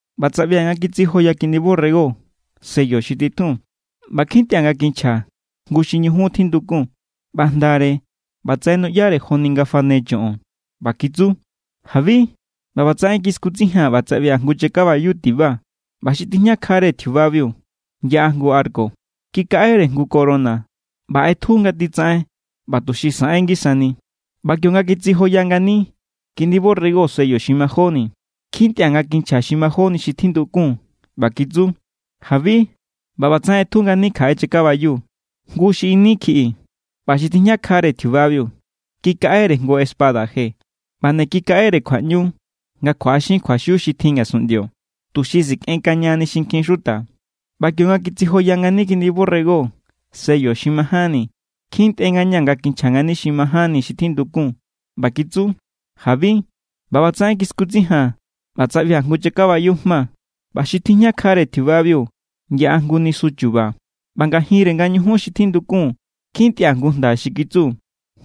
ꞌBa tsaꞌbia̱ nga kitsijoya Kiꞌndi borrego sello xi titjun, ꞌba kjintꞌia̱ nga kinchja jngu xi ñujun tjindukun. ꞌBa jndare, ꞌbatsaꞌen nuꞌyare joni nga fane choꞌon. ꞌBa kitsu: “¡Jabi!” ꞌBa ꞌbatsaꞌen kiskutsijia̱n ꞌba tsaꞌbia̱ jngu chakabayu tiba. ꞌBa xi tijñakjare tjiubabiu yaꞌa jngu arco. Kikaꞌere jngu corona ꞌba ꞌetju nga titsaꞌen ꞌba tuxi saꞌen ngisani. ꞌBa kionga kitsijoya ngani Kiꞌndi borrego sello xi majóni, kjintꞌia̱ nga kinchja xi majóni xi tjindukun ꞌba kitsu: “¡Jabi!” ꞌBa ꞌbatsaꞌen ꞌetju ngani kjaꞌe chakabayu, jngu xi ini kjiꞌi. ꞌBa xi tijñakjare tjiubabiu, kikaꞌere jngu espada je. ꞌBa nde kikaꞌere kjuaꞌñu nga kjuaꞌaxin kjuaxiu xi tjin ngasunꞌndio, tuxi sikꞌenkañani xinkjin xuta. ꞌBa kionga kitsijoya ngani Kiꞌndi borrego sello xi majánni, kjintꞌe ngañaa̱ nga kinchja ngani xi majánni xi tjindukun ꞌba kitsu: “¡Jabi!” ꞌBa ꞌbatsaꞌen kiskutsijia̱n ꞌba tsaꞌbia̱ jngu chakabayu jma. ꞌBa xi tijñakjare tjiubabiu yaꞌa jngu nisu chu̱ba̱. ꞌBa ngajinre nga ñujun xi tjindukun kjintꞌia̱ jngu jnda xi kitsu: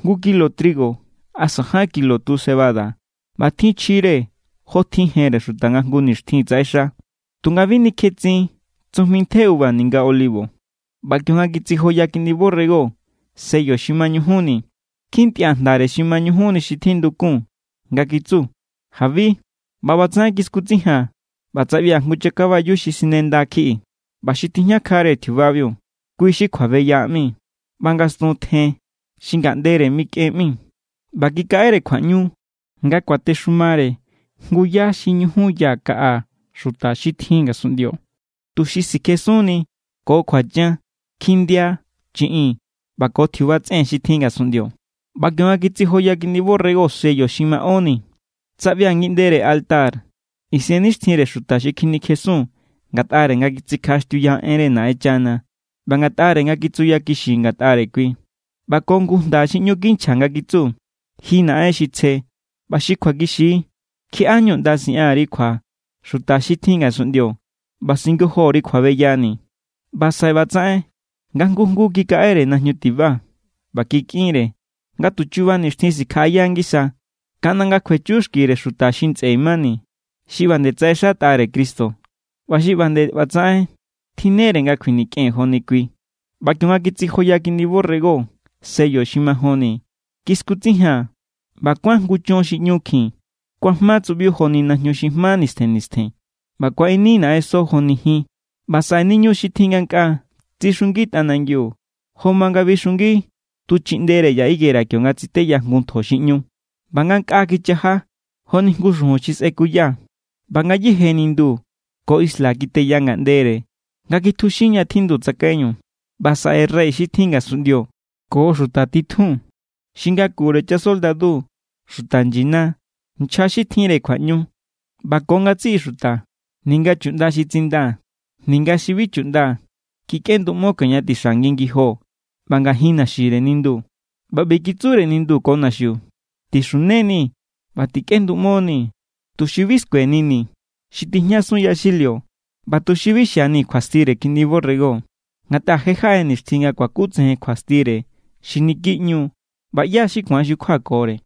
“Jngu kilo trigo asa ján kilo tu cebada ꞌbatjin chjire jotjin jenre xuta nga jngu nixtjin tsaꞌexa. Tunga bi nikjetsin tsujmi ntje uva ninga olivo.” ꞌBa kionga kitsijoya Kiꞌndi borrego sello xi mañujunni, kjintꞌia̱ jndare xi mañujunni xi tjindukun nga kitsu: “¡Jabi!” ꞌBa ꞌbatsaꞌen kiskutsijia̱n ꞌba tsaꞌbia̱ jngu chakabayu xi sinenda kjiꞌi. ꞌBa xi tijñakjare tjiubabiu, kui xi Kjuabeya ꞌmi, ꞌba ngastun tjen xi Ngaꞌndere mikꞌen ꞌmi. ꞌBa kikaꞌere kjuaꞌñu nga kuatexumare jngu yá xi ñujun ya kaꞌa xuta xi tjin ngasunꞌndio, tuxi sikjesunni ko kjuachan, kjindia, chiꞌin ꞌba ko tjiuba tsꞌen xi tjin ngasunꞌndio. ꞌBa kionga kitsijoya Kiꞌndi borrego sello xi maꞌónni, tsaꞌbia̱ ngiꞌndere altar isennixtjinre xuta xi kjinikjesun ngatꞌare nga kitsikjaꞌaxtiuya enre Naꞌenchana ꞌba ngatꞌare nga kitsuyakixi ngatꞌare kui. ꞌBa ko jngu jnda xi ꞌñu kinchja nga kitsu: “Ji Naꞌen xi tsje ꞌba xi kjuakixi=, ¿kjiaꞌa=ñu ꞌnda siꞌan_ri kjua xuta xi tjin ngasunꞌndio ꞌba singojo_ri kjuabeyani̱?” ꞌBa saꞌe ꞌbatsaꞌen nga jngu jngu kikaꞌere najñu tiba. ꞌBa kikꞌinre nga tu chuba nixtjin sikjaꞌaya ngisa, kaꞌnda nga kjuechu xkire xuta xi ntsꞌe mani, xi ꞌba nde tsaꞌexatꞌare Cristo ꞌba xi ꞌba nde ꞌbatsaꞌen tjinnere nga kjuinikꞌen joni kui. ꞌBa kionga kitsijoya Kiꞌndi borrego sello xi majonni, kiskutsijia̱n ꞌba kuán jngu chon xi ꞌñukjin. Kuajma tsuꞌbiu joni najñu xi jma nistjen nistjen. ꞌBa kuaꞌini naꞌenso joni jin. ꞌBa saꞌe niñu xi tjin ngankꞌaa tsixungi tꞌanangiu jo ma nga bixungi tu chiꞌndere ya higuera kionga tsiteya jngu ntjo xi ꞌñu. ꞌBa ngankꞌaa kichaja joni jngu xujun xi sꞌekuya. ꞌBa ngayéje nindu ko isla kiteya ngaꞌndere nga kitjuxin ña tjindu tsakaiñu. ꞌBa saꞌe rey xi tjin ngasunꞌndio ko xuta titjun, xi ngakure chasoldadu, xuta nyina, nchja xi tjinre kjuaꞌñu ꞌba ko ngatsiꞌi xuta ninga chuꞌnda xi tsindaa̱ ninga xi bi chuꞌnda kikꞌenduꞌmo kioña tixa ngi ngijo ꞌba ngajin naxire nindu. ꞌBa ꞌbi kitsure nindu ko naxiu: “Tixuneni ꞌba tikꞌenduꞌmonii̱, tuxi bi skuenini̱ xi tijñasun yaxilio ꞌba tuxi bi xianii̱ kjuastire Kiꞌndi borrego. Ngatꞌa je= jaꞌe nixtjin nga kuakutsejen kjuastire xi niki ꞌñu=, ¿ꞌba ꞌyá= xi ku̱an xukjuakore?”